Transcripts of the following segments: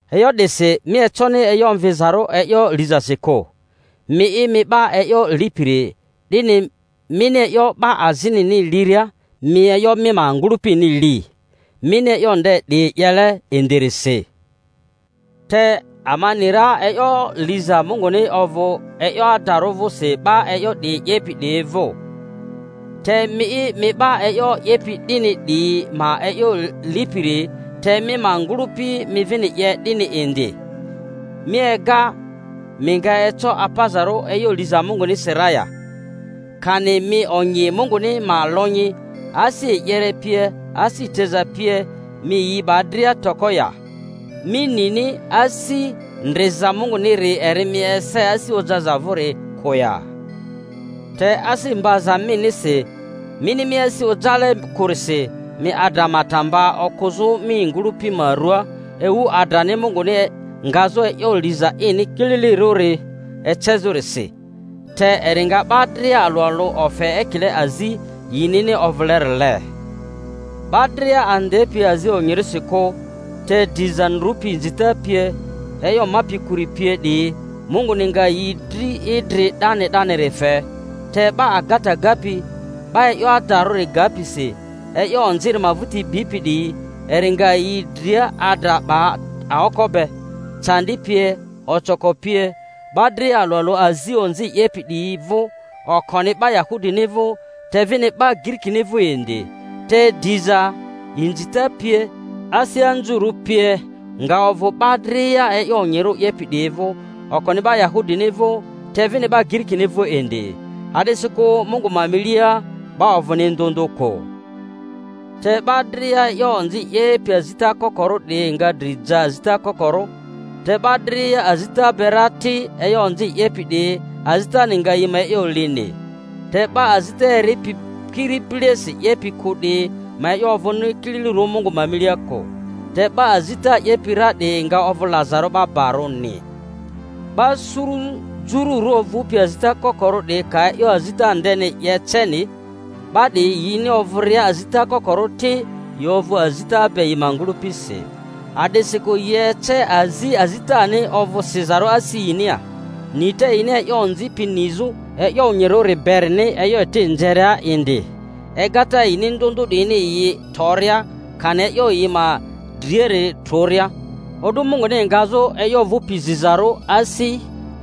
E'yo 'disi mi econi e'yo omvizarᴜ e'yo lizasi kᴜ, mi'i, mi 'ba e'yo lipiri; 'dini mini e'yo 'ba azinini liria mi e'yo mi ma ngᴜlᴜpini li, mini e'yo nde 'diyi 'yele indirisi. Te ama ni ra e'yo liza Munguni ovᴜ e'yo adarᴜ vᴜsi 'ba e'yo 'diyi 'yepi 'diyi vᴜ. Te mi'i, mi 'ba e'yo 'yepi 'dini 'diyi ma e'yo lipiri te mi ma ngᴜlᴜpi mi vini 'ye 'dini indi, mi ega mi nga eco apazarᴜ e'yo liza Mungunirisi ra ya? Kani mi onyi Munguni ma lonyi, asi e'yere pie, asi teza pie, mi yi 'ba dria toko ya? Mi nini asi ndriza Munguniri eri mi ese asi ojaza vᴜri kᴜ ya? Te asi mbaza minisi mini mi asi ojale kᴜrisi, mi adra ma ta mba okᴜzᴜ mi ngᴜlᴜpi ma ruaa ewu adrani Munguni ngazᴜ e'yo liza ini kililirᴜri ecezᴜrisi. Te eri nga 'ba dria alᴜ alᴜ ofe ekile azi yinini ovᴜlerile: 'ba dria andepi azi onyirᴜsi kᴜ, te diza ndrupi inzita pie, e'yo mapi kᴜri pie 'diyi, Munguni nga yi dri idri 'dani 'daniri fe; te 'ba agata gapi, 'ba e'yo adarᴜ gapi si e'yo onziri ma vᴜti bipi 'diyi, eri nga yi dria adra 'ba aoko be. Candi pie, ocoko pie, 'ba dria alᴜ alᴜ azi onzi 'yepi 'diyi vᴜ, okoni 'ba Yahudini vᴜ, te vini 'ba Girikini vᴜ indi, te drza, inzita pie, asi anzurᴜ pie nga ovᴜ 'ba dria e yo onyirᴜ 'yepi 'diyi vᴜ, okoni 'ba Yahudini vᴜ, te vini 'ba Girikini vᴜ indi. A’disikᴜ Mungu ma milia 'ba ovᴜni ndᴜ ndᴜ kᴜ. Te 'ba dria e'yo onzi 'yepi azita kokorᴜ 'diyi nga dri ja azita kokorᴜ, te 'ba dria azita be ra ti, e'yo onzi 'yepi 'diyi, azitani nga yi ma e'yo lini. Te 'ba azita eripi kiri bilesi 'yepi kᴜ 'diyi ma e'yo ovᴜni kililirᴜ Mungu ma milia kᴜ, te 'ba azita 'yepi ra 'diyi nga ovᴜ lazarᴜ 'ba barᴜni. 'Ba suru jururᴜ ovᴜpi azita kokorᴜ 'diyi ka e'yo azita ndeni 'ye ceni, 'ba 'diyi yini ovᴜria azita kokorᴜ ti, yi ovᴜ azita be yi ma ngᴜlᴜpisi. A'disikᴜ yi ece azi azitani ovᴜ sizarᴜ asi yinia, nita yini e'yo onziri pi nizᴜ e'yo onyirᴜri berini e'yo eti nzeria indi, egata yini ndᴜ ndᴜ 'diyini yi toria kani e'yo yi ma driari trᴜria, o'du Munguni ngazᴜ e'yo ovᴜpi zizarᴜ asi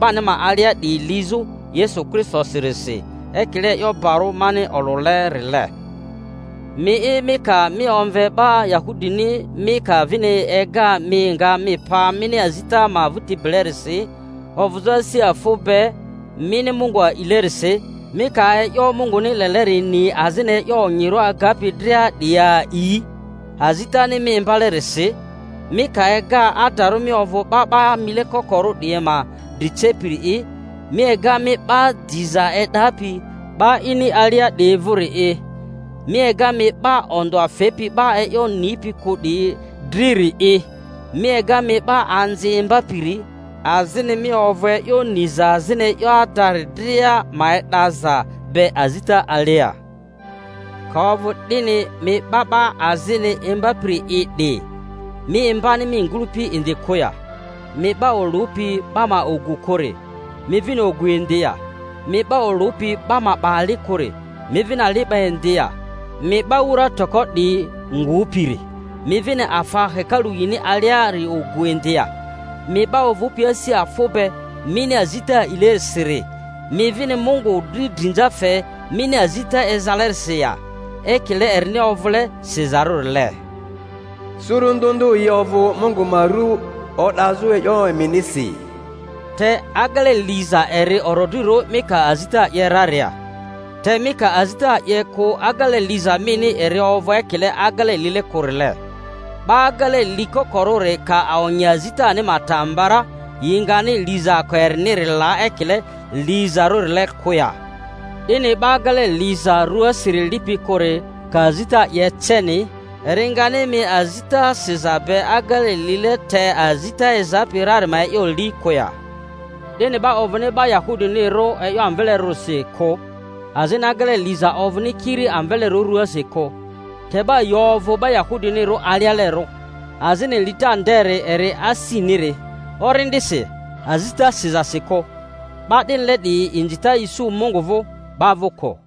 'bani ma alia 'diyi lizᴜ Yesu Kristosirisi, ekile e'yo bari mani olᴜlerile. Mi'i, mi ka mi omve 'ba Yahudini, mi ka vini ega mi nga mi pa mini azita ma vᴜti bilerisi, ovᴜzᴜ asi afᴜ be mini Mungu a'ilerisi, mi ka e'yo Munguni leleri ni, azini e'yo onyirᴜ agapi dria 'diyi a'i, azitani mi imbalerisi, mi ka ega adarᴜ mi ovᴜ 'ba 'ba mile kokorᴜ 'diyi ma dri cepiri'i, mi ega mi 'ba diza e'dapi 'ba ini alia 'diyi vᴜri'i, mi ega mi 'ba ondᴜa fepi 'ba e'yo nipi kᴜ 'diyi driri'i, mi ega mi 'ba anzi imbapiri, azini mi ovᴜ e'yo niza azini e'yo adari dria ma e'daza be azita alia— ka ovᴜ 'dini, mi 'ba 'ba azini imbapiri'i 'di, mi imbani mi ngᴜlᴜpi indi kᴜ ya? Mi 'ba olᴜpi 'ba ma ogu kᴜri, mi vini ogu indi ya? Mi 'ba olᴜpi 'ba ma 'ba ali kᴜri, mi vini ali 'ba indi ya? Mi 'ba wura toko 'diyi ngupiri, mi vini afa hekalu yini aliari ogu indi ya? Mi 'ba ovᴜpi asi afᴜ be mini azita a'ilerisiri, mi vini Mungu dri drinza fe mini azita ezalerisi ya? Ekile erini ovᴜle sizarᴜrile, Suru ndᴜ ndᴜ yi ovᴜ Mungu ma ru o'dazᴜ e'yo eminisi. Te agele liza eri orodrirᴜ mi ka azita 'ye raria; te mi ka azita 'ye kᴜ agele liza mini eri ovᴜ ekile agele lile kᴜrile. 'Ba agele likokorᴜri ka onyi azitani ma ta mba ra, yi ngani lizaako eriniri la ekile lizarᴜrile kᴜ ya? 'Dini 'ba agele liza ruasiri lipi kᴜri ka azita 'ye ceni, eri ngani mi azita siza be agele lile te azita ezapi rari ma e'yo li kᴜ ya? 'Dini 'ba ovᴜni 'ba Yahudinirᴜ e'yo amvelerᴜrisi kᴜ, azini agele liza ovᴜni kiri amvelerᴜ ruasi kᴜ. Te 'ba yi ovᴜ 'ba Yahudinirᴜ alialerᴜ, azini lita nderi eri asiniri, orindisi, azita sizasi kᴜ. 'Ba 'dinile 'diyi inzita isu Mungu vᴜ, 'ba vᴜ kᴜ.